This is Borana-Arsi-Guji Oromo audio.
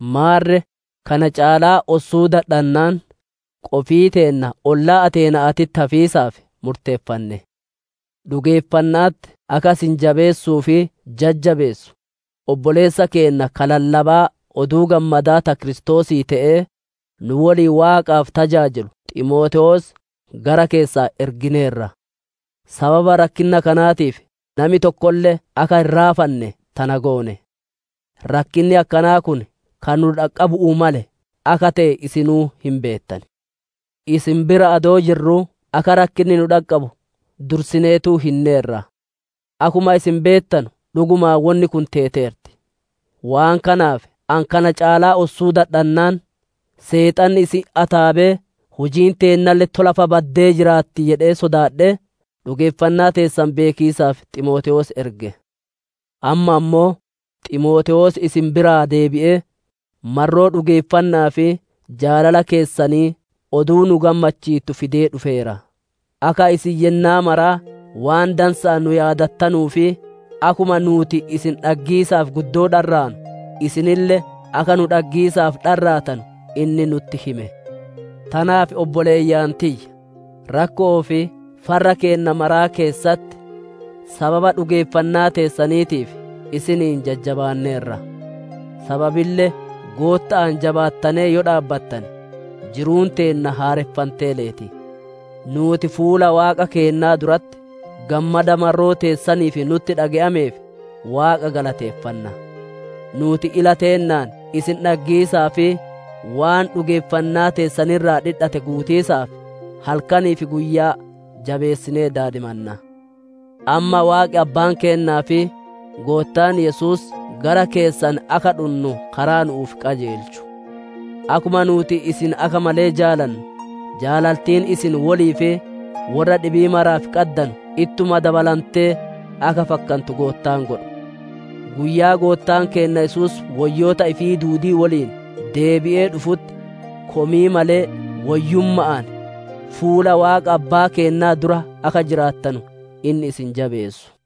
Maarre kana caalaa ossuu dadhannaan, qofii teenna ollaa Ateena'aatitti hafiisaaf murteeffanne. Dhugeeffanna'atti akka isin jabeessuu fi jajjabeessu, obboleessa keenna ka lallabaa Oduu Gammadaa ta Kiristoosii te'ee, nu woliin Waaqaaf tajaajilu Ximootewoos gara keessan ergineerra. Sababa rakkinna kanaatiif nami tokkolle akka hin raafanne tana goone. Rakkinni akkanaa kun ka nu dhaqqabu'uu male akka te'e isinuu hin beettan. Isin bira adoo jirruu akka rakkinni nu dhaqqabu dursineetuu hinneerra. Akkuma isin beettanu dhugumaan wonni kun teeteerti. Waan kanaaf ani kana caalaa ossuu dadhannaan, Seexanni isin ataabee hujiin teennaalle tola fa'a baddee jiraatti jedhee sodaadhee, dhugeeffannaa teessan beekiisaaf Ximootewoos erge. Amma ammoo Ximootewoos isin biraa deebi'ee, marroo dhugeeffanna'aa fi jaalala keessanii oduu nu gammachiittu fidee dhufeera. Akka isin yennaa maraa waan dansa'aan nu yaadattanuu fi akkuma nuuti isin dhaggiisaaf guddoo dharraanu, isinille akka nu dhaggiisaaf dharraatanu inni nutti hime. Tanaaf obboleeyyan tiyya, rakkoo fi farra keenna maraa keessatti, sababa dhugeeffannaa teessaniitiif isiniin jajjabaanneerra. Sababille Gootta'aan jabaattanee yoo dhaabbattane, jiruun teenna haareffantee leeti. Nuuti fuula Waaqa keennaa duratti, gammada marroo teessaniif nutti dhage'ameef Waaqa galateeffanna. Nuuti ila teennaan isin dhaggiisaa fi waan dhugeeffannaa teessan irraa dhidhatte guutiisaaf halkanii fi guyyaa jabeessinee daadimanna. Amma Waaqi Abbaan keennaa fi Goottaan Yesuus gara keessan akka dhunnu karaa nu'uuf qajeelchu! Akkuma nuuti isin akka malee jaalannu, jaalaltiin isin wolii fi worra dhibii maraaf qaddanu ittuma dabalantee akka fakkantu Goottaan godhu. Guyyaa Goottaan keenna Yesuus woyyoota ifii duudii woliin deebi'ee dhufutti, komii malee woyyumma'aan fuula Waaqa Abbaa keennaa dura akka jiraattanu inni isin jabeessu.